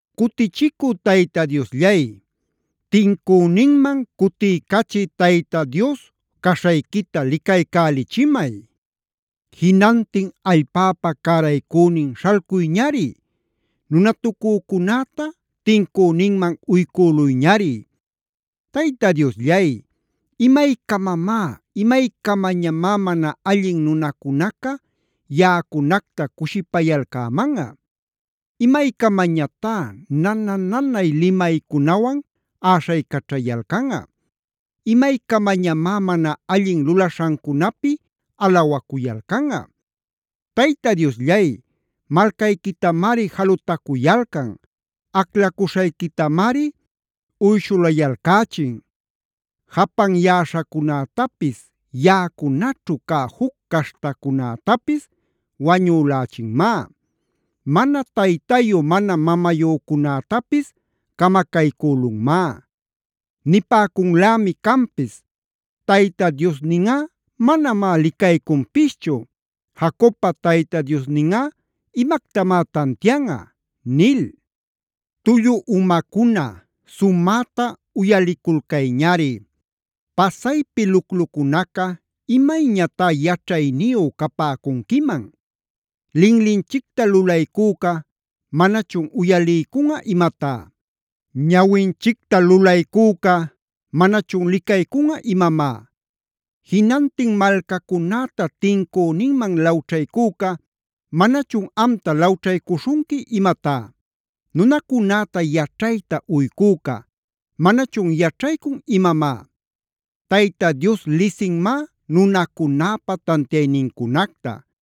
Cutichicü Tayta Diosllay, tincüninman cutiycachï Tayta Dios caśhayquita licaycälichimay. Jinantin allpäpa cäraycünin śhalcuyñari. Nunatucücunäta tincüninman uycüluyñari. Tayta Diosllay, ¿imaycamamá, imaycamañamá mana allin nunacunaca yaꞌacunacta cushipayalcämanꞌa? ¿Imaycamañatá nana-nanay limaycunawan äśhaycaćhayalcanꞌa? ¿Imaycamañamá mana allin lulaśhancunapi alawacuyalcanꞌa? Tayta Diosllay, malcayquitamari jalutacuyalcan. Aclacuśhayquitamari uyshulayalcächin. Japanyäśhacunätapis, yaꞌacunaćhu cä juc caśhtacunätapis wañülächinmá. Mana taytayu mana mamayücunätapis camacaycülunmá. Nipäcunlämi canpis: “Tayta Diosninꞌa manamá licaycunpischu. Jacobpa Tayta Diosninꞌa imactamá tantianꞌa” nil. ¡Tullu umacuna sumäta uyaliculcayñari! Pasaypi luclucunaca ¿imayñatá yaćhayniyu capäcunquiman? Linlinchicta lulaycüca ¿manachun uyaliycunꞌa imatá? Ñawinchicta lulaycüca ¿manachun licaycunꞌa imamá? Jinantin malcacunäta tincüninman lawćhaycüca ¿manachun amta lawćhaycuśhunqui imatá? Nunacunäta yaćhayta uycüca ¿manachun yaćhaycun imamá? Tayta Dios lisinmá nunacunäpa tantiaynincunacta.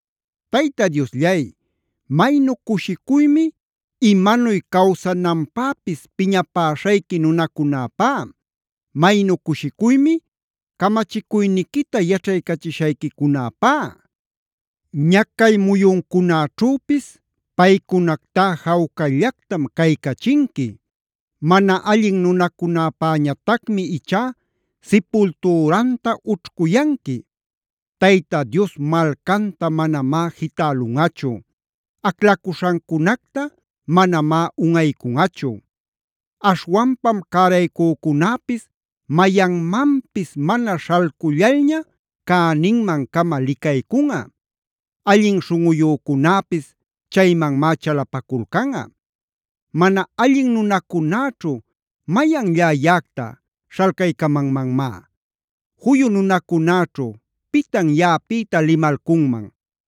Tayta Diosllay, maynu cushicuymi imanuy cawsananpäpis piñapäshayqui nunacunäpá. Maynu cushicuymi camachicuyniquita yaćhaycachishayquicunäpá. Ñacay muyuncunaćhüpis paycunactá jawcallactam caycachinqui. Mana allin nunacunäpäñatacmi ichá sipultüranta ućhcuyanqui. Tayta Dios malcanta manamá jitälunꞌachu. Aclacuśhancunacta manamá unꞌaycunꞌachu. Aśhwanpam cäraycücunäpis mayanmanpis mana śhalcullalña cäninman-cama licaycunꞌa. Allin śhunꞌuyücunäpis chaymanmá chalapaculcanꞌa. Mana allin nunacunäćhu ¿mayanllá yaꞌacta śhalcaycamanmanmá? Juyu nunacunäćhu ¿pitan yaꞌapïta limalcunman?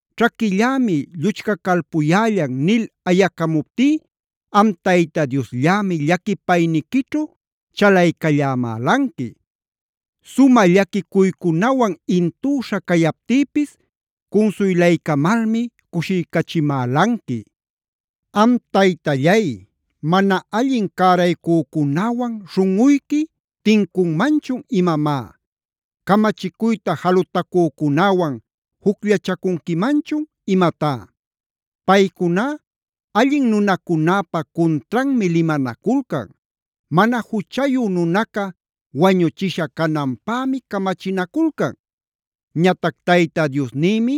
“Ćhaquillämi lluchcacalpuyällan” nil ayacamuptí am Tayta Diosllämi llaquipayniquićhu chalaycallämälanqui. Sumä llaquicuycunawan intüśha cayaptïpis cunsuylaycamalmi cushiycachimälanqui. Am Taytallay, ¿mana allin cäraycücunäwan śhunꞌuyqui tincunmanchun imamá? ¿Camachicuyta jalutacücunäwan jucllachacunquimanchun imatá? Paycuná allin nunacunäpa cuntranmi limanaculcan. Mana juchayu nunaca wañuchisha cananpämi camachinaculcan. Ñatac Tayta Diosnïmi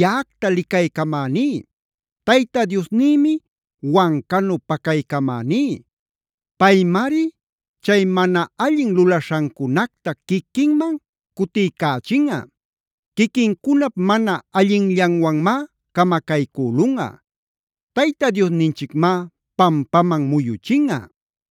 yaꞌacta licaycamäní. Tayta Diosnïmi wancanu pacaycamäní. Paymari chay mana allin lulaśhancunacta quiquinman cutiycächinꞌa. Quiquincunap mana allinllanwanmá camacaycülunꞌa. Tayta Diosninchicmá pampaman muyuchinꞌa.